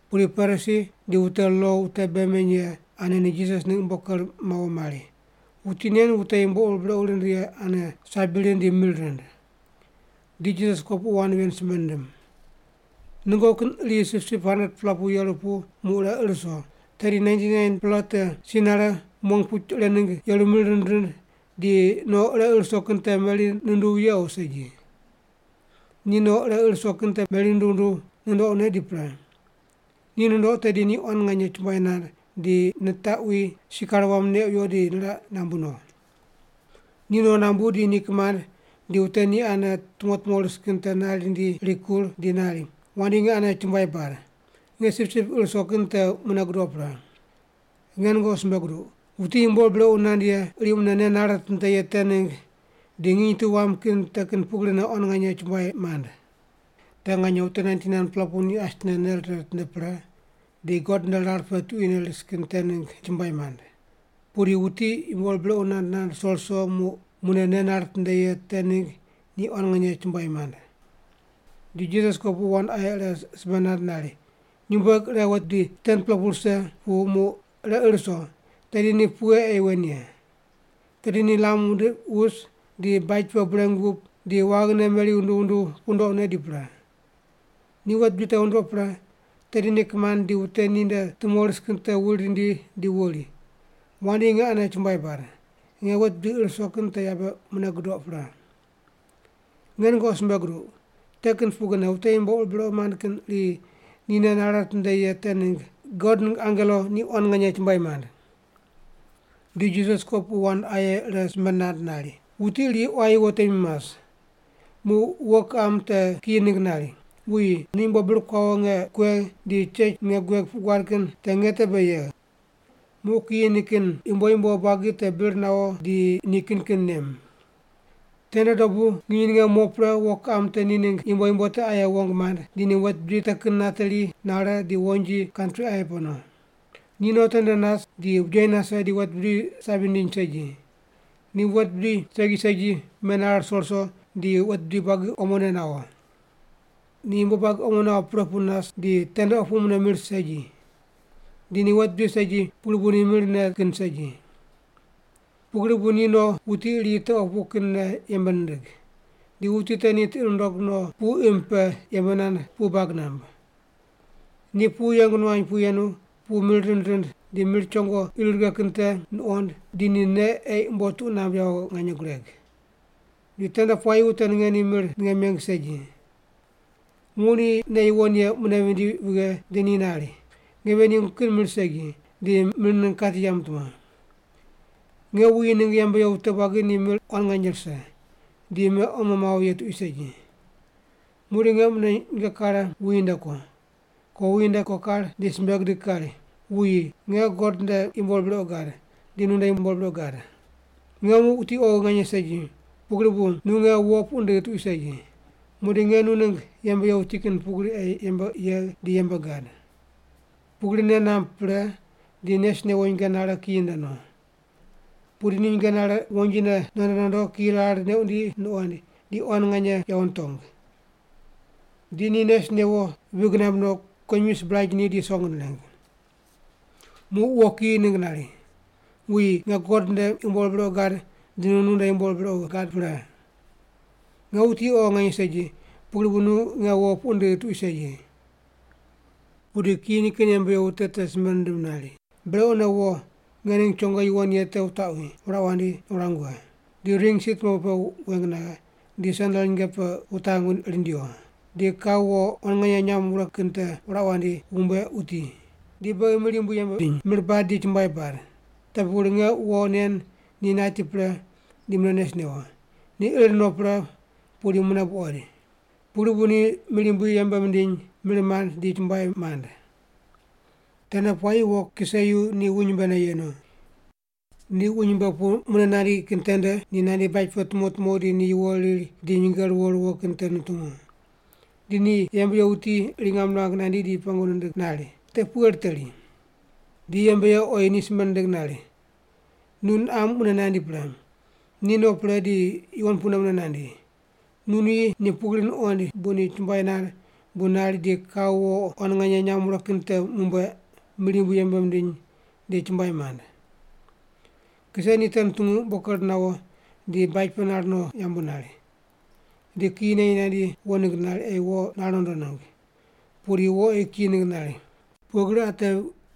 Pudi Parisi di wute lo wute bei meny ye ane ni Jisas ningg umbo ker mawo mari, “Wuti nen wute yumbo ur brequ rind ye ane sabi rind di mir rind.” Di Jisas kopuqu wand ven simbe nindim: “Nungoqi kin iri sipsip 100-pela pu yeru pu muq ire ir wuso. Tedi 99-pela te si nare, mong puch ire ningg yeru mir rind rind, di no ire ir wuso kin te meri nunduw ye o segi? Ni no ire ir wuso kin meri nunduw nunduw nundoqne di pre. Ni nundoq tedi ni quan nganye chumbuai nand di nitaqwi sikar wam neq wiyo di niraq nambu no. Ni no nambu di ni kimand di wute ni ane tumo tumo ris kin te nari rindi rikur di nari, ‘Wandi nge ane chumbuai bad. Nge sipsip ir wuso kin te mune gudoq pre.’ Nge nungoqi simbe guduq, wuti yumbo ur brequ nand ye iri mune nei nare nitinde ye te ningg di nginy tu wam kin te kin pugrine quan nganye chumbuai mand. Te nganye wute 99-pela pu asine nei rire ritinde pre di God nde rar pe tuquine ris kin te ningg ni chumbuai mand. Pudi wuti yumbo ur brequ nand nand ruso ruso muq mune nei nare nitinde ye te ningg ni quan nganye chumbuai mand.” Di Jisas kopuqu wand aye ire simbe nand nari, “Nyumbueg ire wet bidi 10-pela pu rise pu muq ire ir wuso, tedi ni pughe ei wen ye? Tedi ni lam wundiq wus, di baj pe bureng wup, di waghine meri wunduw wunduw wundoqne di pre. Ni wet bidi te wundoq pre, tedi ni kimand di wute ni nde tumo ris kin te wuri rindi di wuri, ‘Wandi nge ane chumbuai bad. Nge wet bidi ir wuso kin te yabe mune gudoq pre.’ Nge nungoqi simbe guduq. Te kin pugrine wute yumbo ur brequ mand kin iri ni nei nare nitinde ye te ningg God ningg angelo ni quan nganye chumbuai mand.” Di Jisas kopuqu wand aye ire simbe nand nari, “Wuti iri quayi wo temi mas. Muq wo kiqam te kiyi ningg nari, ‘Wuyi, nu yumbo bir kuawo nge ninge kuegh di chech ninge gueg puq guad kin te nge te be yegh.’ Muq kiyi nikin ningg yumbo yumbo buagi te bir nawo di ni kin kin nem. “Tende dobu nginy ninge mo pre wo kiqam te ni ningg yumbo yumbo te ni rundo wute aye wong mand, di ni wet bidi te kin nateri nare di wonji, kantri aye pe no. Ni no tende nas, di bujeyi nase di wet bidi sabi nindiny segi. Ni wet bidi segi segi menare ruso ruso di wet bidi buagi omone nawo. Ni yumbo buagi omo nawo pre pu nas, di tende opu mune mir segi. Di ni wet bidi segi pugri bu ni mir ne kin segi. Pugri bu ni no wuti iri te opu kinne yembe nindig. Di wuti te ni tiqi nundog no pu imb pe yembe nand pu bag namb. Ni pu yeng nuany pu yenu, pu ni mir rind di mir chongo ir righe kin te nuqond di ni ne ei umbo tuq namb yawo nganye gureg. Di tende puayi wute ninge ni mir ninge meng segi. “Muq ni nei yuwon ye mune vindi vighe di ni nari, ‘Nge ven yengu kin mir segi di mir ningg kati yamb tumo. Nge wuyi ningg yembe ye wute buagi ni mir quan nganye rise, di me omo mawo ye tuqui segi. Muqdi nge mune nyinge kare wuyi nde ko. Ko wuyi nde ko kar di simbe gidig kari, “Wuyi, nge God nde yumbo ur brequ gad, di nu nde yumbo ur brequ gad. Nge muq wuti oghi nganye segi, pugri bu nu nge wo puq ndigh tuqui segi. Muqdi nge nu ningg yembe ye wuti kin pugri ei yembe yegh di yembe gad.” ’ Pugri nei namb pre di nes newo nyinge nare kiyi nde no. “Pudi ni nyinge nare wonjine nondo nondo kiyi rar neq wundi nuqoind, di quan nganye yawo nitong. Di ni nes newo vig namb no, kuwonyimi sibraj ni di song nireng. “Muq wo kiyi ningg nari, ‘Wuyi, nge God nde yumbo ur brequ gad di nu nde yumbo ur brequ gad pre. Nge wuti oghi nganye segi, pugri bu nu nge wo puq ndigh tuqui segi.’ “Pudi kiyi nikin yembe ye wute te simbe nindim nari, ‘Brequne wo nge ningg chongo yuwon ye te wutaqwi, wuraq wandi, wurang wughe. Di ring si tumuepu pe weng naghe, di sendel nyinge pe wutang rindiwo. Di kau wo quan nganye nyam wure kin te wuraq wandi, wumbueq wuti. Di beghi mir yumbui yembe bidiny, mir bad di chumbuai bad. Te pugri nge wo nen ni nati pre di mune nes newo, ni ir no pre pudi mune buqoid.’ Pugri bu ni mir yumbui yembe mindiny, mir mand di chumbuai mand. “Tende puayi wo kiseyu ni wuny mbene yenu. Ni wuny mbe pu mune nandi kin tende, ni nandi baj pe tumo tumo di ni yuwo riri di nyinge ruwo ruwo kin te nutungu. Di ni yembe ye wuti iri ngam nirang nandi di pengu nindig nari, ‘Te pughe riteri?’ Di yembe ye oyi ni simbe nindig nari, ‘Nu niqam mune nandi pre. Ni no pre di yuwon pune mune nandi. Nu nuyi ni pugri nuqoind bu ni chumbuai nand bu nari di kau wo quan nganye nyam wure kin te mumbueq, mir yumbui yembe mindiny di chumbuai mand.’ “Kise ni te nutungu umbo ker nawo di baj pe nar no yambu nari. Di kiyi neyi nandi wo ningg nari, ei wo nar nondo ningg. Pudi wo oyi kiyi ningg nari, ‘Pughe gri ate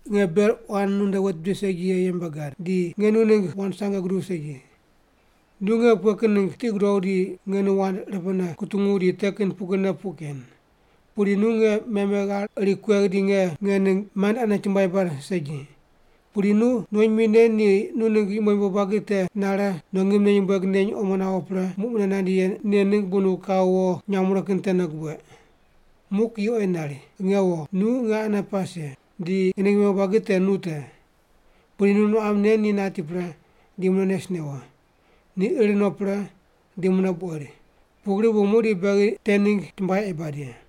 nge ber quan nu nde wet bidi segi ye yembe gad, di nge nu ningg wand sange guduw segi. Nu nge pughe kin ningg tiqi gudogh di nge nu wand irepene kutungu di te kin pugrine puq ken. Pudi nu nge meme ghar iri kuegh di nge nge ningg mand ane chumbuai bad segi. Pudi nu nuwonyimi nen ni nu ningg yumbo yumbo buagi te nare no ngimne nyumbueg neny omo nawo pre, muq mune nandi ye nen ningg bu nu kau wo nyam wure kin tene gubueq.’ “Muq kiyi oyi nari, ‘Nge wo, nu nge ane pas ye, di nge ningg yumbo yumbo buagi te nu te. Pudi nu niqam nen ni nati pre, di mune nes newo, ni ir no pre di mune buqoid. Pugri bu muqdi beghi te ningg chumbuai ei bad ye’.”